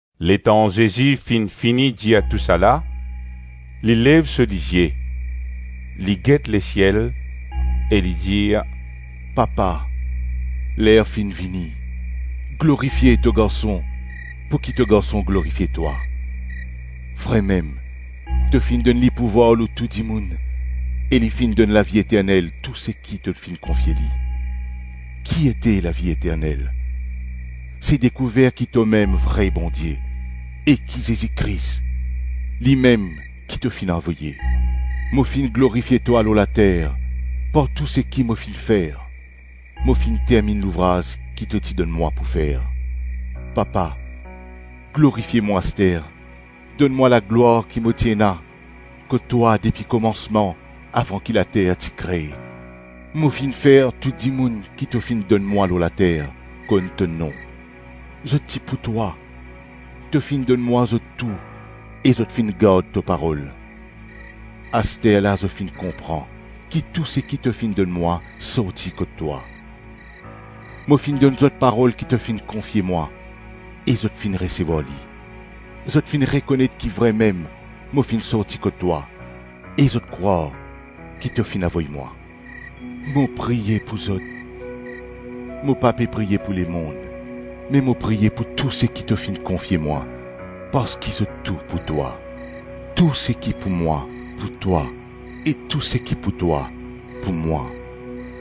Letan Zezi finn fini dir tousala, li lev so lizie, li get lesiel e li dir, “Papa, ler finn vini; glorifie to Garson, pouki to Garson glorifie twa. Vremem, to finn donn li pouvwar lor tou dimoun e li finn donn lavi eternel tou seki to finn konfie li. Ki ete lavi eternel? Se dekouver ki tomem vre Bondie e ki Zezi Kris, limem ki to finn avoye. Mo finn glorifie twa lor later par tou seki mo finn fer; mo finn terminn louvraz ki to ti donn mwa pou fer. Papa, glorifie mwa aster; donn mwa laglwar ki mo ti ena kot twa depi komansman, avan ki later ti kre. Mo finn fer tou dimoun ki to finn donn mwa lor later, konn to nom; zot ti pou twa, to finn donn mwa zot tou e zot finn gard to parol. Asterla zot finn konpran ki tou seki to finn donn mwa sorti kot twa. Mo finn donn zot parol ki to finn konfie mwa, e zot finn resevwar li. Zot finn rekonet ki vremem mo finn sorti kot twa, e zot krwar ki to finn avoy mwa. Mo priye pou zot; mo pa pe priye pou lemonn me mo priye pou tou seki to finn konfie mwa, parski zot tou pou twa. Tou seki pou mwa, pou twa e tou seki pou twa, pou mwa;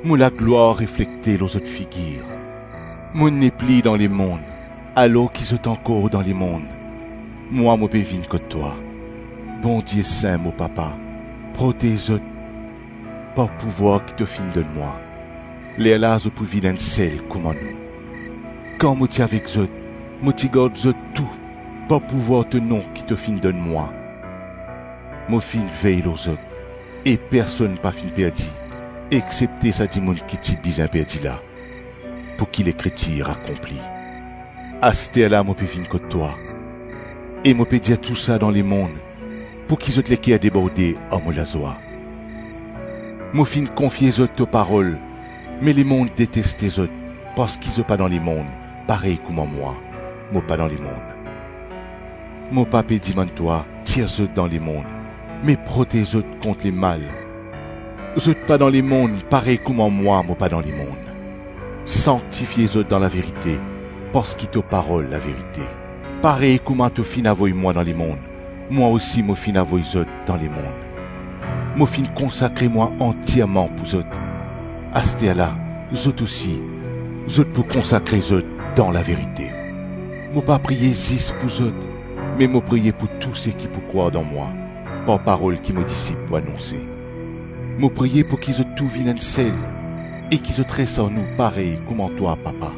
mo laglwar reflekte lor zot figir. Mo nepli dan lemonn alors ki zot ankor dan lemonn; mwa mo pe vinn kot twa. Bondie sin, mo Papa! Protez zot par pouvwar ki to finn donn mwa. Lerla zot pou vinn enn sel kouma nou. Kan mo ti avek zot, mo ti gard zot tou par pouvwar to nom ki to finn donn mwa; mo finn vey lor zot, e personn pa finn perdi exsepte sa dimoun ki ti bizin perdi la pouki Lekritir akonpli. Asterla mo pe vinn kot twa e mo pe dir tousa dan lemonn pouki zot leker deborde ar mo lazwa. Mo finn konfie zot to parol me lemonn deteste zot parski zot pa dan lemonn parey kouma mwa, mo pa dan lemonn. Mo pa pe dimann twa, tir zot dan lemonn me protez zot kont lemal. Zot pa dan lemonn parey kouma mwa, mo pa dan lemonn. Sanktifie zot dan laverite parski to parol laverite. Parey kouma to finn avoy mwa dan lemonn, mwa osi mo finn avoy zot dan lemonn. Mo finn konsakre mwa antierman pou zot; asterla, zot osi, zot pou konsakre zot dan laverite. Mo pa priye zis pou zot me mo priye pou tou seki pou krwar dan mwa, par parol ki mo disip pou anonse. Mo priye pouki zot tou vinn enn sel e ki zot res ar nou parey kouma twa Papa,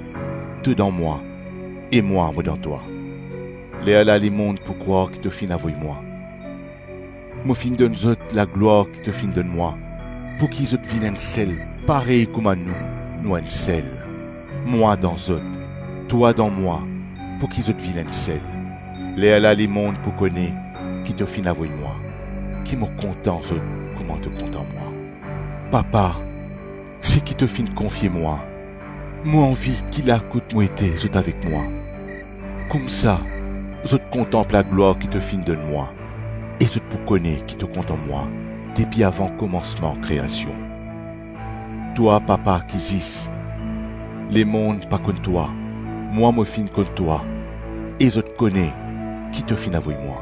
to dan mwa e mwa mo dan twa. Lerla lemonn pou krwar ki to finn avoy mwa. Mo finn donn zot laglwar ki to finn donn mwa pouki zot vinn enn sel parey kouma nou, nou enn sel. Mwa dan zot, twa dan mwa pouki zot vinn enn sel. Lerla lemonn pou kone ki to finn avoy mwa, ki mo kontan zot kouma to kontan mwa. Papa, seki to finn konfie mwa, mo anvi ki la kot mo ete zot avek mwa; koumsa zot kontanp laglwar ki to finn donn mwa e zot pou kone ki to kontan mwa depi avan komansman kreasion. Twa Papa ki zis, lemonn pa konn twa; mwa mo finn konn twa e zot kone ki to finn avoy mwa.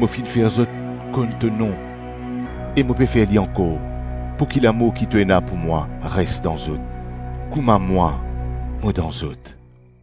Mo finn fer zot konn to nom e mo pe fer li ankor pouki lamour ki to ena pou mwa res dan zot, kouma mwa mo dan zot.”